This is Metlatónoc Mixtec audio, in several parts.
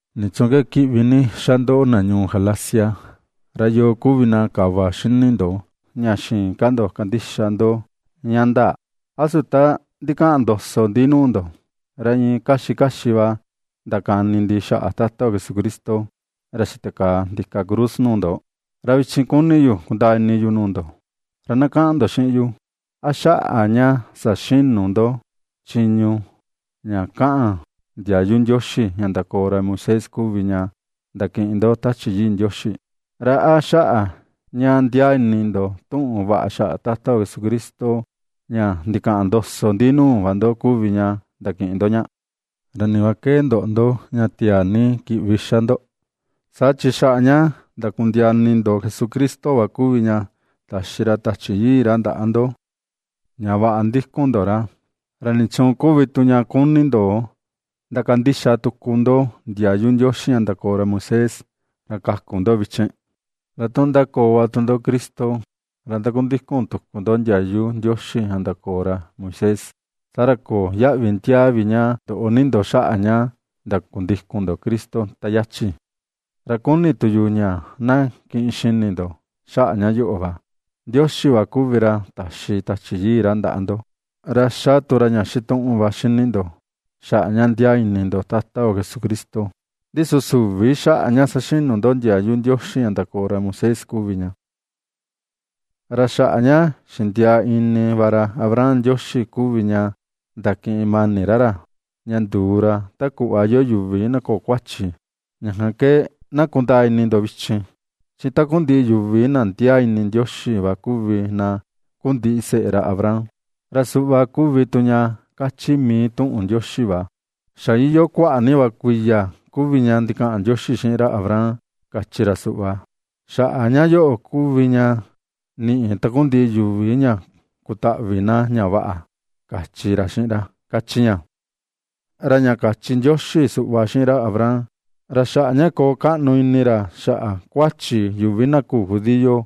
¡¿Nichuun ke kiꞌvi ni xa ndo, na Galacia?! ¿Ra yoo kuvi na kava xini ndo, ña xïin ka ndo kandixa ndo ña ndaa? ¿A su ta ndikaꞌan ndoso ndi nuu ndo, ra iin kaxi kaxi va ndakani ndi xaꞌa Tata yo Jesucristo, ra xitakaa ndika cruz nuu ndo? Ra vichin, kuni yu kundaa ini yu nuu ndo, ra na kaꞌan ndo xiꞌin yu: ¿A xaꞌa ña saxinu ndo chiñu ña kaꞌan ndiayu Ndioxi ña ndakoo ra Moisés kuvi ña ndakiꞌin ndo Tachi Yii Ndioxi? ¿Ra a xaꞌa ña ndiaa ini ndo tuꞌun vaꞌa xaꞌa Tata yo Jesucristo ña ndikaꞌan ndoso ndi nuu va ndo kuvi ña ndakiꞌin ndo ña? ¿Ra ni va ke ndoꞌo ndo, ña tiaa ni kiꞌvi xa ndo? Saa chi xaꞌa ña ndakundiaa ini ndo Jesucristo va kuvi ña taxi ra Tachi Yii ra ndaꞌa ndo ña vaꞌa ndikun ndo ra. ¿Ra nichuun kuvi tu ña kuni ndo ndakandixa tuku ndo ndiayu Ndioxi ña ndakoo ra Moisés, ra kaku ndo vichin? Ra tu ^ndakoo va tu ndo Cristo, ra ndakundikun tuku ndo ndiayu Ndioxi ña ndakoo ra Moisés, saa ra köo yaꞌvi ndiaa vi ña ndoꞌo ni ndo xaꞌa ña ndakundikun Cristo ta yachi. Ra kuni tu yu ña na kiꞌin xini ndo xaꞌa ña yoꞌo va: Ndioxi va kuvi ra taxi Tachi Yii ra ndaꞌa ndo, ra ^xa tu ra ña xituꞌun va ^xini ndo, xaꞌa ña ndiaa ini ndo Tata yo Jesucristo, ndi su süvi xaꞌa ña saxinu ndo ndiayu Ndioxi ña ndakoo ra Moisés kuvi ña. Ra xaꞌa ña xindiaa ini va ra Abraham, Ndioxi kuvi ña ndakiꞌin mani ra ra, ña nduu ra ta kuꞌva iyoo yuvi na köo kuachi. Ña kan ke na kundaa ini ndo vichin, chi takundiꞌi yuvi na ndiaa ini Ndioxi va kuvi na kuu ndiseꞌe ra Abraham. Ra suꞌva kuvi tu ña ^kachi mii tuꞌun Ndioxi va. Xa iyoo kuaꞌa ni va kuiya kuvi ña ndikaꞌan Ndioxi xiꞌin ra Abraham, kachi ra suꞌva: “Xaꞌa ña yoꞌo kuvi ña niꞌi takundiꞌi yuvi ña kutaꞌvi na ña vaꞌa”, kachi ra xiꞌin ra, ^kachi ña. Ra ña kachi Ndioxi suꞌva xiꞌin ra Abraham, ra xaꞌa ña koo kaꞌnu ini ra xaꞌa kuachi yuvi na küu judío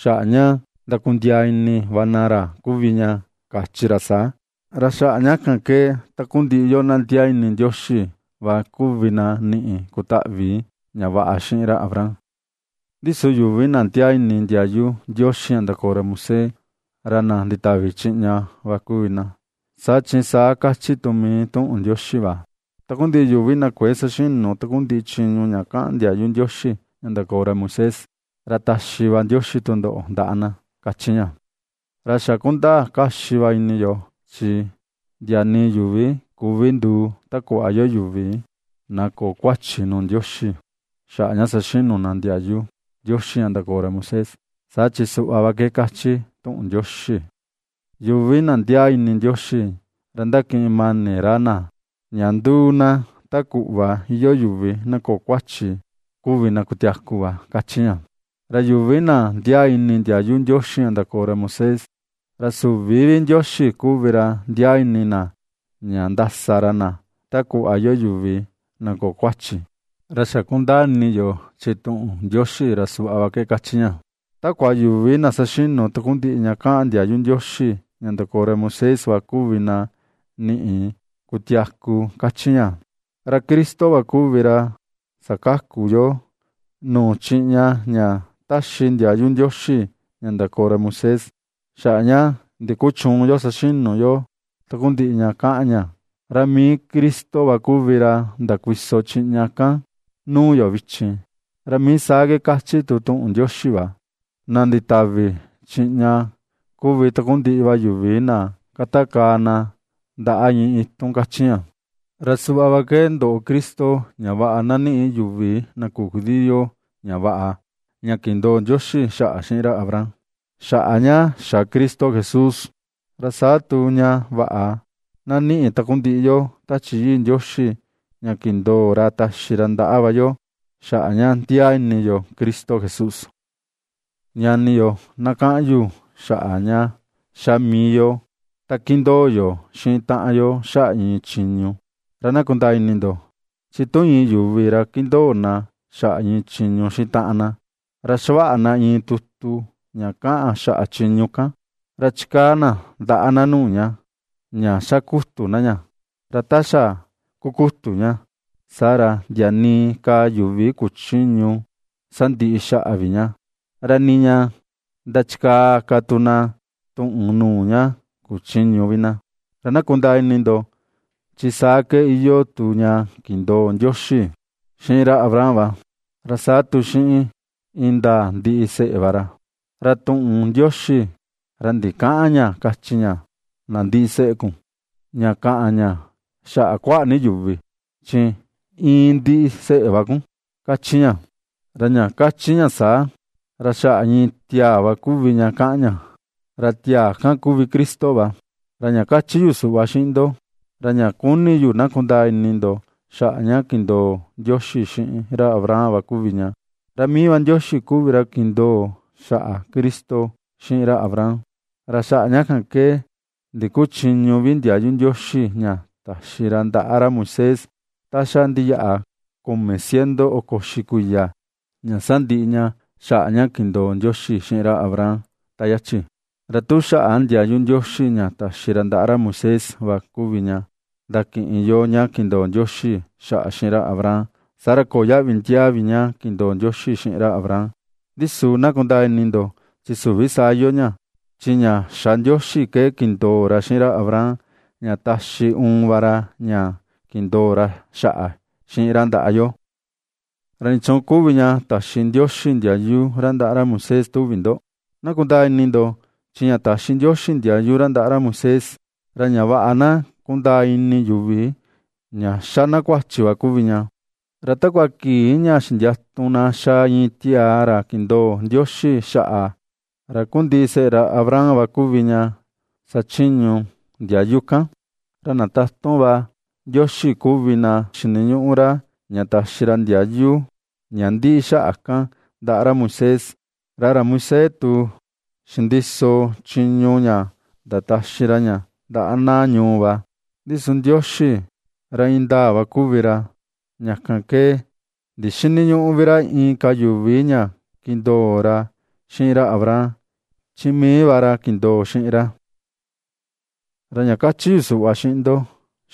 xaꞌa ña ndakundiaa ini va na ra kuvi ña, kachi ra saa. Ra xaꞌa ña kan ke takundiꞌi yoo na ndiaa ini Ndioxi va kuvi na niꞌi kutaꞌvi ña vaꞌa xiꞌin ra Abraham. Ndi su yuvi na ndiaa ini ndiayu Ndioxi ña ndakoo ra Moisés, ra na nditavi chiꞌña va kuvi na. Saa chi saa kachi tu mii tuꞌun Ndioxi va: “Takundiꞌi yuvi na kuëe saxinu takundiꞌi chiñu ña kaꞌan ndiayu Ndioxi ña ndakoo ra Moisés, ra taxi va Ndioxi tundoꞌo ndaꞌa na”, ^kachi ña. Ra xa kundaa kaxi va ini yo, chi ndia nii yuvi küvi nduu ta kuꞌva iyoo yuvi na köo kuachi nuu Ndioxi, xaꞌa ña saxinu na ndiayu Ndioxi ña ndakoo ra Moisés; saa chi suꞌva va ke kachi tuꞌun Ndioxi: “Yuvi na ndiaa ini Ndioxi, ra ndakiꞌin mani ra na ña ^nduu na ta kuꞌva iyoo yuvi na köo kuachi, kuvi na kutiaku va”, ^kachi ña. Ra yuvi na ndiaa ini ndiayu Ndioxi ña ndakoo ra Moisés, ra süvi vi Ndioxi kuvi ra ndiaa ini na ña ndasa ra na ta kuꞌva iyoo yuvi na köo kuachi. Ra xa kundani yo chi tuꞌun Ndioxi, ra suꞌva va ke kachi ña: “Takua yuvi na saxinu takundiꞌi ña kaꞌan ndiayu Ndioxi ña ndakoo ra Moisés va kuvi na niꞌi kutiaku”, kachi ña. Ra Cristo va kuvi ra sakaku yoo nuu chiꞌña ña ^taxi ndiayu Ndioxi ña ndakoo ra Moisés xaꞌa ña ndikuchüun yo saxinu yo takundiꞌi ña kaꞌan ña, ra mii Cristo va kuvi ra ndakuiso chiꞌña kan nuu yo vichin, ra mii saa ke kachi tu tuꞌun Ndioxi va: “Na nditavi chiꞌña kuvi takundiꞌi va yuvi na katakaa na ndaꞌa iin itun”, ^kachi ña. Ra suꞌva ke ndoꞌo Cristo ña vaꞌa na niꞌi yuvi na küu judío ña vaꞌa, ña kindoo Ndioxi xaꞌa xiꞌin ra Abraham, xaꞌa ña xa Cristo Jesús. Ra saa tu ña vaꞌa na niꞌi takundiꞌi yo Tachi Yii Ndioxi ña kindoo ra taxi ndaꞌa va yo, xaꞌa ña ndiaa ini yo Cristo Jesús. Ñani yo, na kaꞌan yu xaꞌa ña ^xa mii yo ta kindoo yo xiꞌin taꞌan yo xaꞌa iin chiñu, ra na kundaa ini ndo: Chi tu iin yuvi ra kindoo na xaꞌa iin chiñu xiꞌin taꞌan na, ra xavaꞌa na iin tutu ña kaꞌan xaꞌa chiñu kan, ra chikaa na ndaꞌa na nuu ña, ña xa kutu na ña. Ra ta xa kukutu ña, saa ra ndia nii ka yuvi kuchïñu sandiꞌi xaꞌa vi ña, ra nii ña ndachikaa ka tu na tuꞌun nuu ña kuchïñu vi na. Ra na kundaa ini ndo, chi saa ke iyoo tu ña kindoo Ndioxi xiꞌin ra Abraham va, ra saa tu xiꞌin indaa ndiseꞌe va ra. Ra tuꞌun Ndioxi, ra ndikäꞌan ña kachi ña: “na ndiseꞌe kun”, ña kaꞌan ña xaꞌa kuaꞌa ni yuvi, chi “iin ndiseꞌe va kun”, ^kachi ña. Ra ña kachi ña saa; ra xaꞌa iin tiaa va kuvi ña kaꞌan ña, ra tiaa kan kuvi Cristo va. Ra ña kachi yu suꞌva xiꞌin ndo, ra ña kuni yu na kundaa ini ndo xaꞌa ña kindoo Ndioxi xiꞌin ra Abraham va kuvi ña, ra mii va Ndioxi kuvi ra kindoo xaꞌa Cristo xiꞌin ra Abraham, ra xaꞌa ña kan va ke, ndikuchïñu vi ndiayu Ndioxi ña taxi ra ndaꞌa ra Moisés ta xa ndiyaꞌa kumi ciento oko uxi kuiya, ña sandiꞌi ña xaꞌa ña kindoo Ndioxi xiꞌin ra Abraham ta yachin. Ra tu xaꞌa ndiayu Ndioxi ña taxi ra ndaꞌa ra Moisés va kuvi ña, ndakiꞌin yo ña kindoo Ndioxi xaꞌa xiꞌin ra Abraham; saa ra köo yaꞌvi ndiaa vi ña kindoo Ndioxi xiꞌin ra Abraham. Ndi su, na kundaa ini ndo, chi süvi saa iyoo ña, chi ña xa Ndioxi ke kindoo ra xiꞌin ra Abraham, ña taxi uun va ra, ña kindoo ra xaꞌa xiꞌin ra ndaꞌa yo. ¿Ra nichuun kuvi ña taxi Ndioxi ndiayu ra ndaꞌa ra Moisés tuvi ndo? Na kundaa ini ndo, chi ña taxi Ndioxi ndiayu ra ndaꞌa ra Moisés, ra ña vaꞌa na kundaa ini yuvi ña ^xa na kuachi va kuvi ña. Ra takua kii ña xindiatu na xaa iin tiaa ra kindoo Ndioxi xaꞌa, ra kuu ndiseꞌe ra Abraham va kuvi ña xachiñu ndiayu kan. Ra na tatun va Ndioxi kuvi na xiniñuꞌu ra, ña taxi ra ndiayu ña ndiꞌi xaꞌa kan, ndaꞌa ra Moisés, ra ra Moisés tu xindiso chiñu ña ndataxi ra ña ndaꞌa na ñuu va. Ndi su Ndioxi, ra indaa va kuvi ra, ña kan ke ndixïniñuꞌu vi ra inka yuvi ña kindoo ra xiꞌin ra Abraham, chi mii va ra kindoo xiꞌin ra. Ra ña kachi yu suꞌva xiꞌin ndo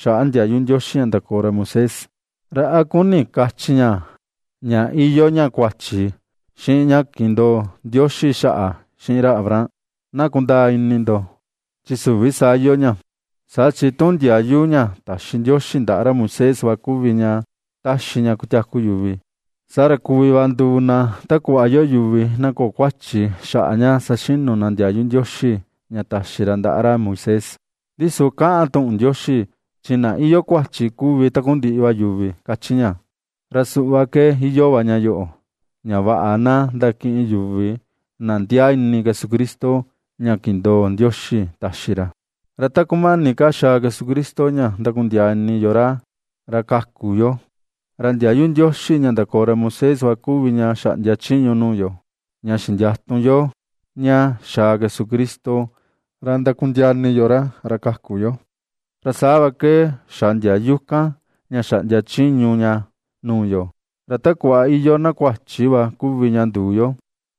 xaꞌa ndiayu Ndioxi ña ndakoo ra Moisés, ¿ra a kuni kachi ña, ña iyoo ña kuachi xiꞌin ña kindoo Ndioxi xaꞌa xiꞌin ra Abraham? Na kundaa ini ndo, chi süvi saa iyoo ña. Saa chi tu ndiayu ña taxi Ndioxi ndaꞌa ra Moisés va kuvi ña ^taxi ña kutiaku yuvi, saa ra kuvi va nduu na ta kuꞌva iyoo yuvi na köo kuachi, xaꞌa ña saxinu na ndiayu Ndioxi ña taxi ra ndaꞌa ra Moisés. Ndi su kaꞌan tuꞌun Ndioxi, chi na iyoo kuachi kuvi takundiꞌi va yuvi, kachi ña. Ra suꞌva ke iyoo va ña yoꞌo, ña vaꞌa na ndakiꞌin yuvi na ndiaa ini Jesucristo, ña kindoo Ndioxi taxi ra. Ra ta kumani ka xaa Jesucristo ña ndakundiaa ini yo ra, ra kaku yo, ra ndiayu Ndioxi ña ndakoo ra Moisés va kuvi ña xaꞌndia chiñu nuu yo, ña xindiatu yo ña xaa Jesucristo ra ndakundiaa ini yo ra, ra kaku yo. Ra saa va ke xa ndiayu kan ña xaꞌndia chiñu ña nuu yo, ra ta kuꞌva iyoo na kuachi va kuvi ña nduu yo,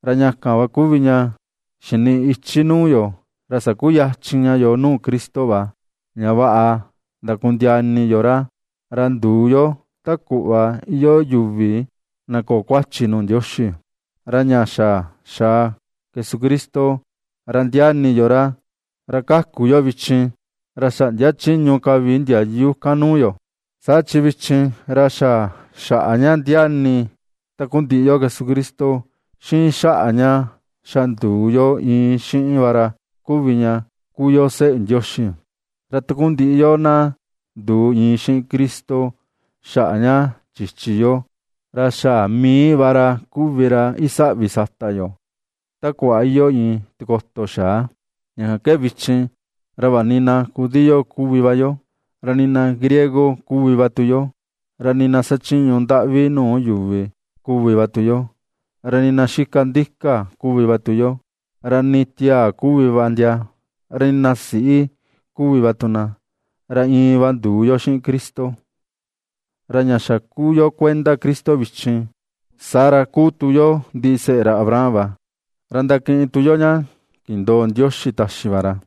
ra ña kan kuvi ña xiniꞌi ichi nuu yu ra sakuyachin ña yoo nuu Cristo va, ña vaꞌa ^ndakundiaa ini yo ra, ra nduu yo, ta kuꞌva iyoo yuvi na köo kuachi nuu Ndioxi. Ra ña xa xaa Jesucristo, ra ndiaa ini yo ra, ra ^kaku yo vichin, ra xäꞌndia chiñu ka vi ndiayu kan nuu yo. Saa chi vichin, ra xa xaꞌa ña ndiaa ini takundiꞌi yo Jesucristo, xiꞌin xaꞌa ña xa nduu yo iin xiꞌin va ra kuvi ña kuu yo seꞌe Ndioxi. Ra takundiꞌi yoo na nduu iin xiꞌin Cristo xaꞌa ña chichi yo, ra xa mii va ra kuvi ra isaꞌvi sata yo, ta kuꞌva iyoo iin tikoto xaa. Ña kan ke vichin, ra vaꞌa ni na judío kuvi va yo, ra nii na griego kuvi va tu yo, ra nii na xachiñu ndaꞌvi nuu yuvi kuvi va tu yo, ra nii na xika ndika kuvi va tu yo, ra nii tiaa kuvi va ndia, ra nii na siꞌi kuvi va tu na, ra iin va nduu yo xiꞌin Cristo. Ra ña xa kuu yo kuenda Cristo vichin, saa ra ^kuu tu yo ndiseꞌe ra Abraham va, ra ndakiꞌin tu yo ña kindoo Ndioxi taxi va ra.